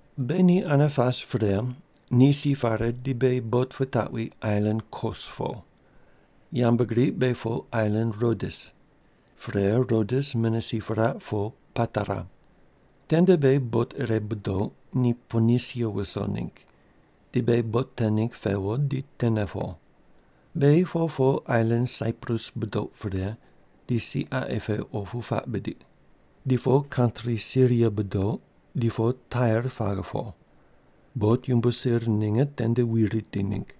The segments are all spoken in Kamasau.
Beghi ni ane pas pre, ni si pare di beghi bot pitaqwi ailan Kos po. Yambgriq beghi po ailan Rodes. Pre, Rodes mune si piraq, po Patara. Tende beghi bot ire budoq, ni Ponisia wuso ningg, di beghi bot te ningg pewo di tene po. Beghi po po ailan Saiprus budoq pre, di si qaqi pe opu puaq bidiq. Di po kantri Siria budoq, di po Tair paghe po. Bot yumbo sir ninge tende wi riti ningg.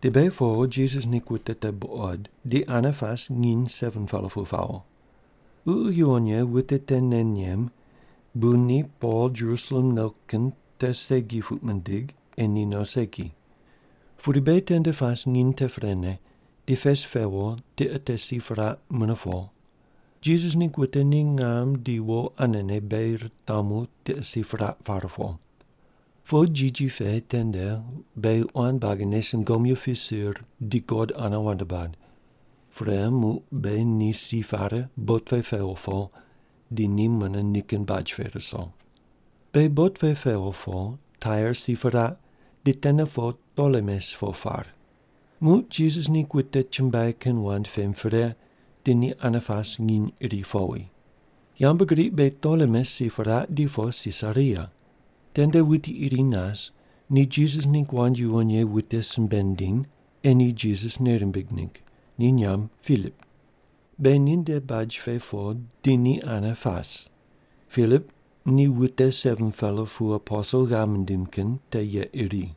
Di beghi po Jisas ningg wute te buqod, di ane pase nginy 7-pela pu pawo. Ququ Yuwon Ye wute te nei nem bu ni Pol Jerusalem no kin te segi puq mindig ei ni no segi. Pudi beghi tende pas nginy te prene, di pes pewo, tiqe te si piraq mune po. Jisas ningg wute ni ngam di wo anene beghi ritamu tiqe si piraq par po. Po jiji pe tende beghi quan buagine sungomyu pisir di God ane wand bad. Pre, muq beghi ni si pare bot pe pewo po, di ni mune nikin baj pe ruso. Beghi bot pe pewo po, Tair si piraq, di tene po Tolemes po par. Muq Jisas ningg wute chumbuai kin wand pem pre, di ni ane pas nginy iri powi. Yambgriq beghi Tolemes si piraq di po Sisaria. Tende wuti iri nas ni Jisas ningg wand yuwon ye wute simbe nindiny ei ni Jisas nei rimbig ningg, ni nyamb Pilip. Beghi ninde baj pe po di ni ane pas. Pilip ni wute 7-pela pu aposel ghav mindim kin te ye iri.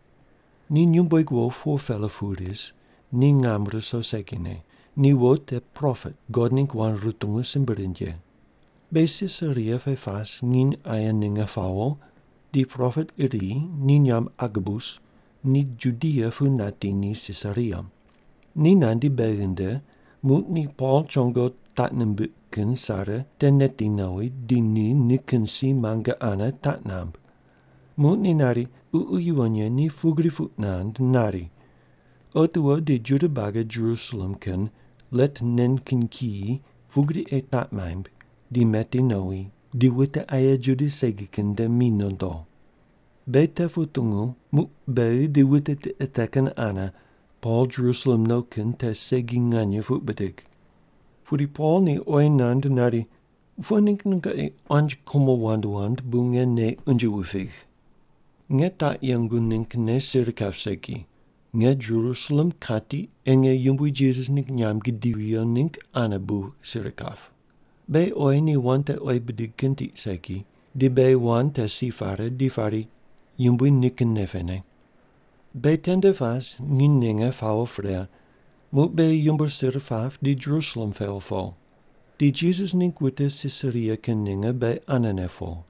Ni nyumbueg wo 4-pela pu ris, ni ngam ruso segine. Ni wo te propet, God ningg wand rutungu simbe rind ye. Beghi Sisaria pe pas nginy aye ninge pawo, di propet iri, ni nyamb Agabus, ni Judia pu nati ni Sisaria. Ni nandi beghi nde, muq ni Pol chongo taq nimbiq kin sare te neti nowi, di ni nikin si muange ane taq namb. Muq ni nari, “Ququ Yuwon Ye ni pugri puq nand nari, ‘Otiwo di Juda buagi Jerusalem kin let nen kin kiyi pugri ei taq maimb di meti nowi di wute aye Juda segi kin nde mi nondo’.” Beghi te putungu, muq beghi di wute tiqe te kin ane Pol Jerusalem no kin te segi nganye puq bidig. Pudi Pol ni oyi nand nari, “Pughe ningg nungoqi quanji kumo wand wand bu nge nei unje wupigh? Nge taq yengu ninggne sir kap segi. Nge Jerusalem kati ei nge Yumbui Jisas ningg nyamb gidivi viyo ningg ane bu sir kap.” Beghi oyi ni wand te oyi bidig kin tiq segi, di beghi wand te si pare di pari, “Yumbui nikin nei pene.” Beghi tende pas nginy ninge pawo pre, muq beghi yumbo sir pap, di Jerusalem pewo po. Di Jisas ningg wute Sisaria kin ninge beghi anene po.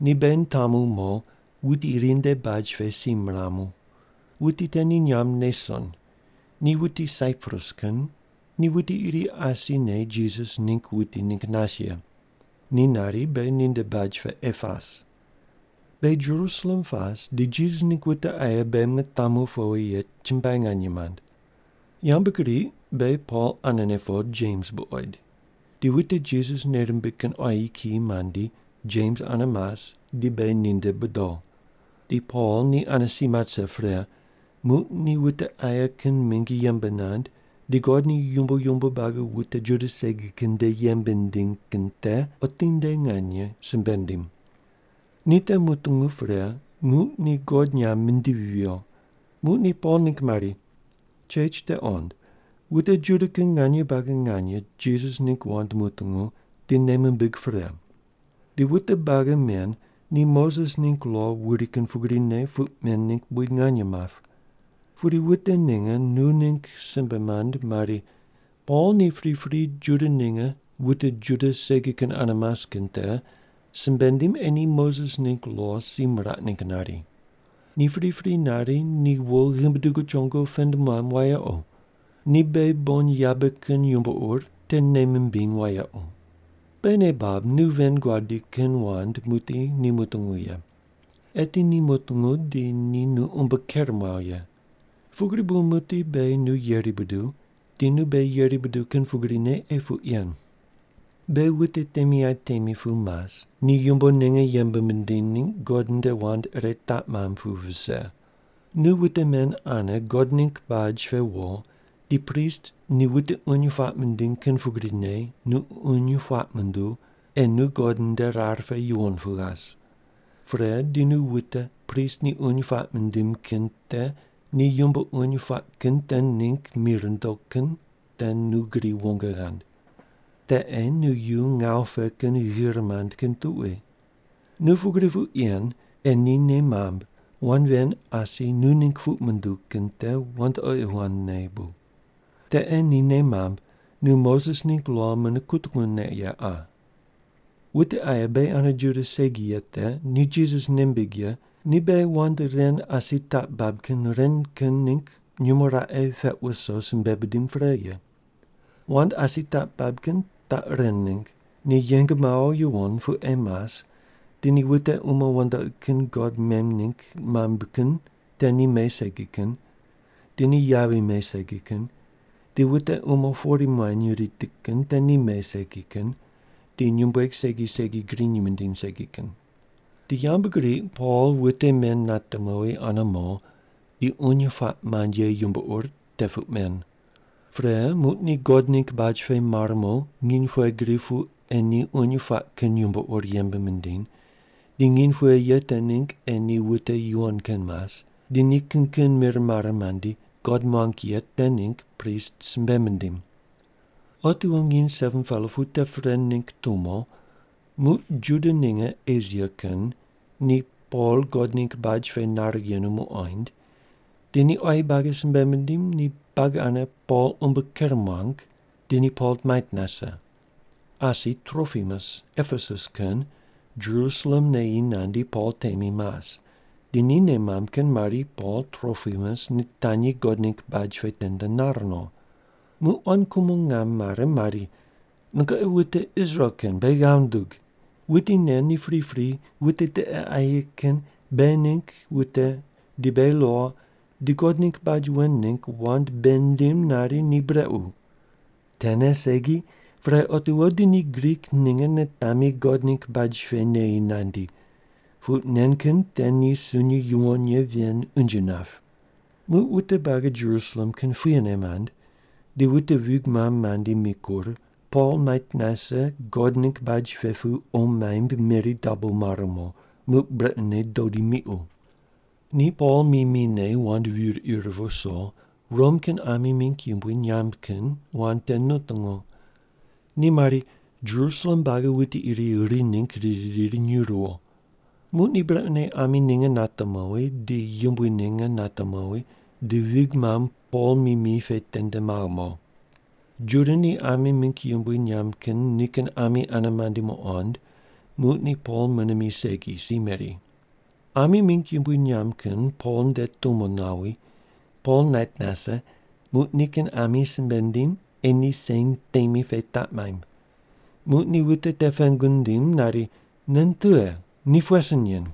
Ni beghi mitamu mo, wuti iri nde baj pe si miramu. Wuti te ni nyamb Neson, ni wuti Saiprus kin, ni wuti iri asine Jisas ningg wuti ningg nas ye. Ni nari beghi ninde baj pe ei pas. Beghi Jerusalem pas di Jisas ningg wute aye beghi mitamu powi ye chumbuai nganye mand. Yambgriq beghi Pol anene po Jems buqoid. Di wute Jisas nei rimbig kin quayi kiyi mandi Jems ane mas di beghi ninde bodo. Di Pol ni ane si mat rise pre muq ni wute aye kin mingi yembe nand di God ni yumbo yumbo buagi wute Juda segi kin nde yembe nindiny kin te otinde nganye simbe nindim. Ni te mutungu pre, muq ni God nyamb mindivi viyo. Muq ni Pol ningg mari, “Chech te qond, wute Juda kin nganye buagi nganye Jisas ningg wand mutungu di nei mimbig pre. Di wute buagi men ni Moses ningg lo wuri kin pugrine puq men ningg buid nganye map. Pudi wute ninge nu ningg simbe mand mari, ‘Pol ni pripri Juda ninge wute Juda segi kin ane mas kin te simbe nindim ei ni Moses ningg lo si miraq ningg nari. Ni pripri nari ni wo ghimbi dugu chongo pend muam wayequ. Di beghi bon yabe kin yumbo ur te nei mimbiny wayequ.’ “Beghi nei bab, nu ven guadi kin wand muqdi ni mutungu ye. Eti ni mutungu di ni nu umbo ker muaw ye. Pugri bu muqdi beghi nu yeri buduw, di nu beghi yeri buduw kin pugrine ei puq yen. Beghi wute temi aye temi pu mas, ni yumbo ninge yembe mindiny ningg God nde wand ire taq mamb pu vise. Nu wute men ane God ningg baj pe wo di prist ni wute uny puaq mindiny kin pugrine nu uny puaq munduw ei nu God nde rar pe yuwon pu ghas. Pre di nu wute prist ni uny puaq mindim kin te ni yumbo uny puaq kin te ningg mi rundo kin te nu gri wong ghand. Te ei ni yu ngawu pe kin ghir mand kin tuqui. Nu pugri puq yen, ei ni nei mamb wand ven asi nu ningg puq munduw kin te wandoqi wandne bu. Te ei ni nei mamb nu Moses ningg lo mune kutungu ne ye qa. “Wute aye beghi ane Juda segi ye te ni Jisas nei mimbig ye ni beghi wand ren asi taq bab kin ren kin ningg nyumo raqe peq wuso simbe bidim pre ye. Wand asi taq bab kin taq ren ningg: Ni yeng mawo yuwon pu ei mas di ni wute umo wandoqi kin god mem ningg mamb kin te ni me segi kin, di ni yavi me segi kin, di wute umo pori muany riti kin te ni me segi kin, di nyumbueg segi segi griny mindiny segi kin.” Di yambgriq Pol wute men nate mowi ane mo di uny puaq mand ye yumbo ur te puq men. Pre muq ni God ningg baj pe mar mo nginy pughe gri pu ei ni uny puaq kin yumbo ur yembe mindiny, di nginy pughe ye te ningg ei ni wute yuwon kin mas, di ni kin kin mir mare mandi God muang ye te ningg prist simbe mindim. Otiwo nginy 7-pela pu te pre ningg tumo, muq Juda ninge Esia kin ni Pol God ningg baj pe nar yenu muqoind, di ni quayi buagi simbe mindim ni buagi ane Pol umbo ker muang, di ni Pol mait nase. Asi Tropimus Epesus kin Jerusalem neyi nandi Pol temi mas, di ni nei mamb kin mari Pol Tropimus nitanyi God ningg baj pe tende nar no. Muq quan kumo ngam mare mari, “Nungoqi wute Israel kin beghi ghav wundug! Wuti nen ni pripri wute tiqe aye kin beghi ningg wute di beghi lo di God ningg baj wen ningg wand bei nindim nari ni brequ. Tene segi, pre otiwo di ni Grik ninge nitami God ningg baj pe neyi nandi, puq nen kin te ni sunyi yuwon ye ven unje nap.” Muq wute buagi Jerusalem kin puyene mand, di wute vig mamb mandi mikur, Pol mait nase God ningg baj pe pu qo maimb meri dabo mar mo. Muq brequne dodi miqu. Ni Pol mi mine, wand vir ir viso Rom kin ami mingg yumbui nyamb kin wand te nutungu. Ni mari, “Jerusalem buagi wuti iri ri ningg riri riri nyuw ruwo.” Muq ni brequne ami ninge nate mowi, di yumbui ninge nate mowi, di vig mamb Pol mi mi pe tende maghe mo. Juda ni ami mingg yumbui nyamb kin nikin ami ane mandi muqond, muq ni Pol mune mi segi, si meri. Ami mingg yumbui nyamb kin Pol nde tumo nawi, Pol nait nase, muq nikin ami simbe nindim ei ni sen temi pe taq maimb. Muq ni wute te pengu nindiny nari, “Nen tughe? Ni pughe sin nen?”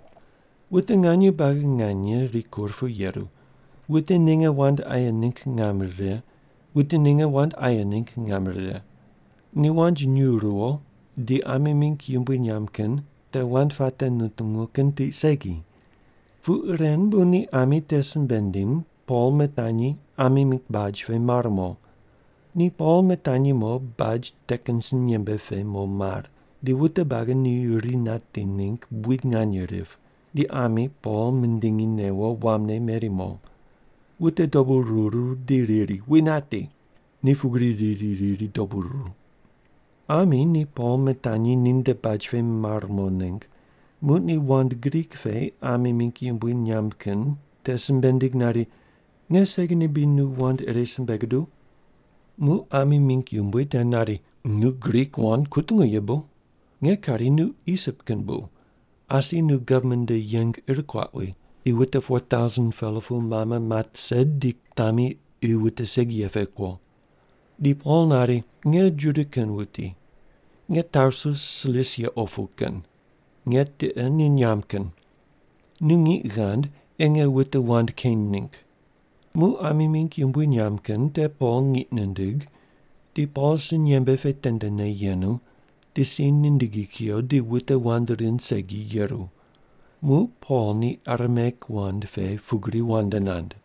Wute nganye buagi nganye rikur pu yeru, wute ninge wand aye ningg ngam rire, wute ninge wand aye ningg ngam rire. Ni wand nyuw ruwo di ami mingg yumbui nyamb kin te wand puate nutungu kin tiq segi. Puq ren bu ni ami te simbe nindim, Pol mitanyi ami mingg baj pe mar mo. Ni Pol mitanyi mo baj te kin sinyembe pe mo mar, di wute buagi ni ri nati ningg buid nganye rip, di ami Pol mindingi newo wamne meri mo. Wute dobu ruru, di riri, “Wi nati!” Ni pugri riri riri dobu ruru. Ami ni Pol mitanyi ninde baj pe mar mo ningg, muq ni wand Grik pe ami mingg yumbui nyamb kin te simbe nindig nari, “Nge segine bri nu wand ire simbe guduw?” Muq ami mingg yumbui te nari, “Nu Grik wand kutungu ye bu? Nge kari nu Isip kin bu, asi nu gavman nde yeng ir kuaq wi, di wute 4,000-pela pu mame mat rise di kutami qi wute segi ye pe kuo.” Di Pol nari, “Nge Juda kin wuti. Nge Tarsus Silisia opu kin. Nge tiqe ni nyamb kin. Nu ngiq ghand ei nge wute wand keny ningg.” Muq ami mingg yumbui nyamb kin te Pol ngiq nindig, di Pol sinyembe pe tendene yenu, di si nindigi kuyo, di wute wand rind segi yeru. Muq Pol ni Arameik wand pe pugri wand nand: